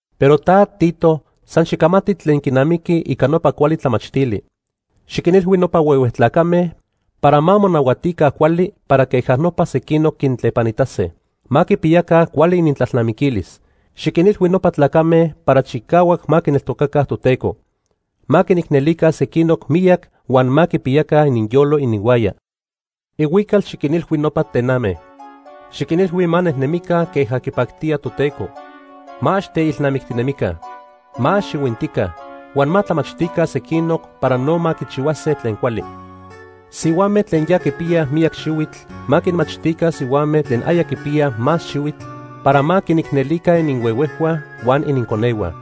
Pero ta Tito, san xicamati tlen quinamiqui ica nopa cuali tlamachtili. Xiquinilhui nopa huehue tlacame para ma monahuatica cuali para queja nopa sequinoc quintlepanitase. Ma quipiyaca cuali inintlalnamiquilis. Xiquinilhui nopa tlacame para chicahuac ma quineltocaca Toteco. Ma quinicnelica sequinoc miyac huan ma quipiyaca ininyolo ininhuaya. Ihuical xiquinilhui nopa tename. Xiquinilhui ma nejnemica queja quipactía Toteco. Ma ax teilnamictinemica. Ma ax ihuintica. Huan ma tlamachtica sequinoc para no ma quichihuase tlen cuali. Sihuame tlen ya quipiyaj miyac xihuitl ma quinmachtica sihuame tlen aya quipiyaj más xihuitl para ma quinicnelica ininhuehuejhua huan ininconehua.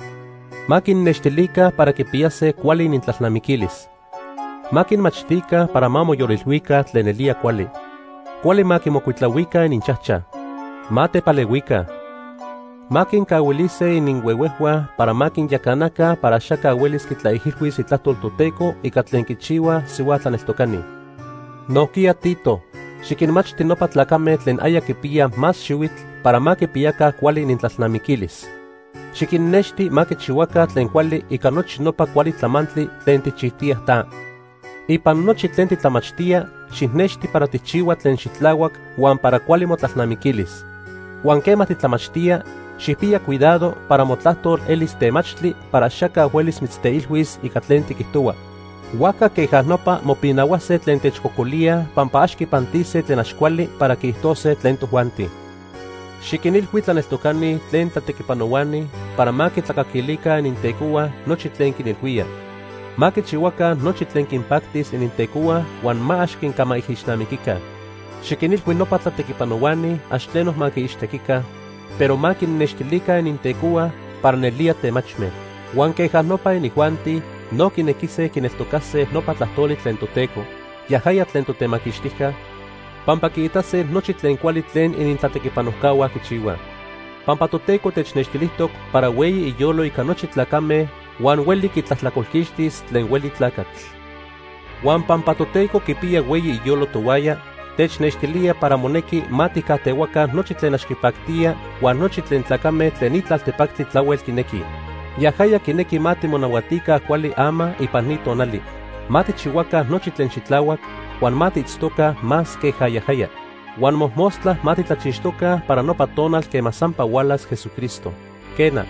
Ma quinnextilica para quipiyase cuali inintlalnamiquilis. Ma quinmachtica para ma moyolilhuica tlen nelía cuali. Cuali ma quimocuitlahuica ininchajchaj. Ma tepalehuica. Ma quincahuilise ininhuehuejhua para ma quinyacanaca para axaca huelis quitlaijilhuis itlajtol Toteco ica tlen quichihuaj sihua tlaneltocani. Nojquiya Tito, xiquinmachti nopa tlacame tlen aya quipiyaj más xihuitl para ma quipiyaca cuali inintlalnamiquilis. Xiquinnexti ma quichihuaca tlen cuali ica nochi nopa cuali tlamantli tlen tijchijtiya ta. Ipan nochi tlen titlamachtía, xijnexti para tijchihua tlen xitlahuac huan para cuali motlalnamiquilis. Huan quema titlamachtía, xijpiya cuidado para motlajtol elis temachtli para axaca huelis mitzteilhuis ica tlen tiquijtohua. Huajca queja nopa mopinahuase tlen techcocolíaj pampa ax quipantise tlen ax cuali para quiijtose tlen tojuanti. Xiquinilhui tlaneltocani tlen tlatequipanohuani para ma quintlacaquilica inintecohua nochi tlen quinilhuíaj. Ma quichihuaca nochi tlen quinpactis inintecohua huan ma ax quincamaijixnamiquica. Xiquinilhui nopa tlatequipanohuani ax tleno ma quiixtequica, pero ma quinnextilica inintecohua para nelía temachme. Huan queja nopa inijuanti no quinequise quineltocase nopa tlajtoli tlen Toteco, yajaya tlen Totemaquixtijca, pampa quiitase nochi tlen cuali tlen inintlatequipanojcahua quichihuaj. Pampa Toteco technextilijtoc para hueyi iyolo ica nochi tlacame huan hueli quitlajtlacolquixtis tlen hueli tlacatl. Huan pampa Toteco quipiya hueyi iyolo tohuaya, technextilía para monequi ma tijcajtehuaca nochi tlen ax quipactía huan nochi tlen tlacame tlen ni tlaltepactli tlahuel quinequij. Yajaya quinequi ma timonahuatica cuali ama ipan ni tonali. Ma tijchihuaca nochi tlen xitlahuac, huan ma tiitztoca más queja yajaya. Huan mojmostla ma titlachixtoca para nopa tonal quema sampa hualas Jesucristo. Quena,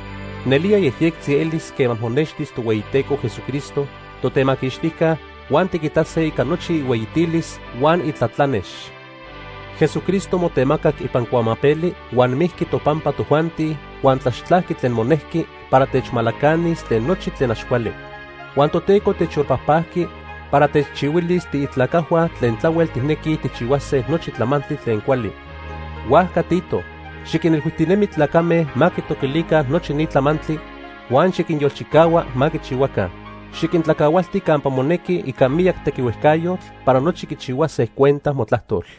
nelía yejyectzi elis quema monextis Tohueyiteco Jesucristo, Totemaquixtijca, huan tiquitase ica nochi ihueyitilis huan itlatlanex. Jesucristo motemacac ipan cuamapeli huan mijqui topampa tojuanti huan tlaxtlajqui tlen monejqui para techmalacanis tlen nochi tlen ax cuali. Huan Toteco techyolpajpajqui para techchihuilis tiitlacajhua tlen tlahuel tijnequij tijchihuase nochi tlamantli tlen cuali. Huajca Tito, xiquinilhuijtinemi tlacame ma quitoquilica nochi ni tlamantli, huan xiquinyolchicahua ma quichihuaca. Xiquintlacahualti campa monequi ica miyac tequihuejcayotl para nochi quichihuase cuenta motlajtol.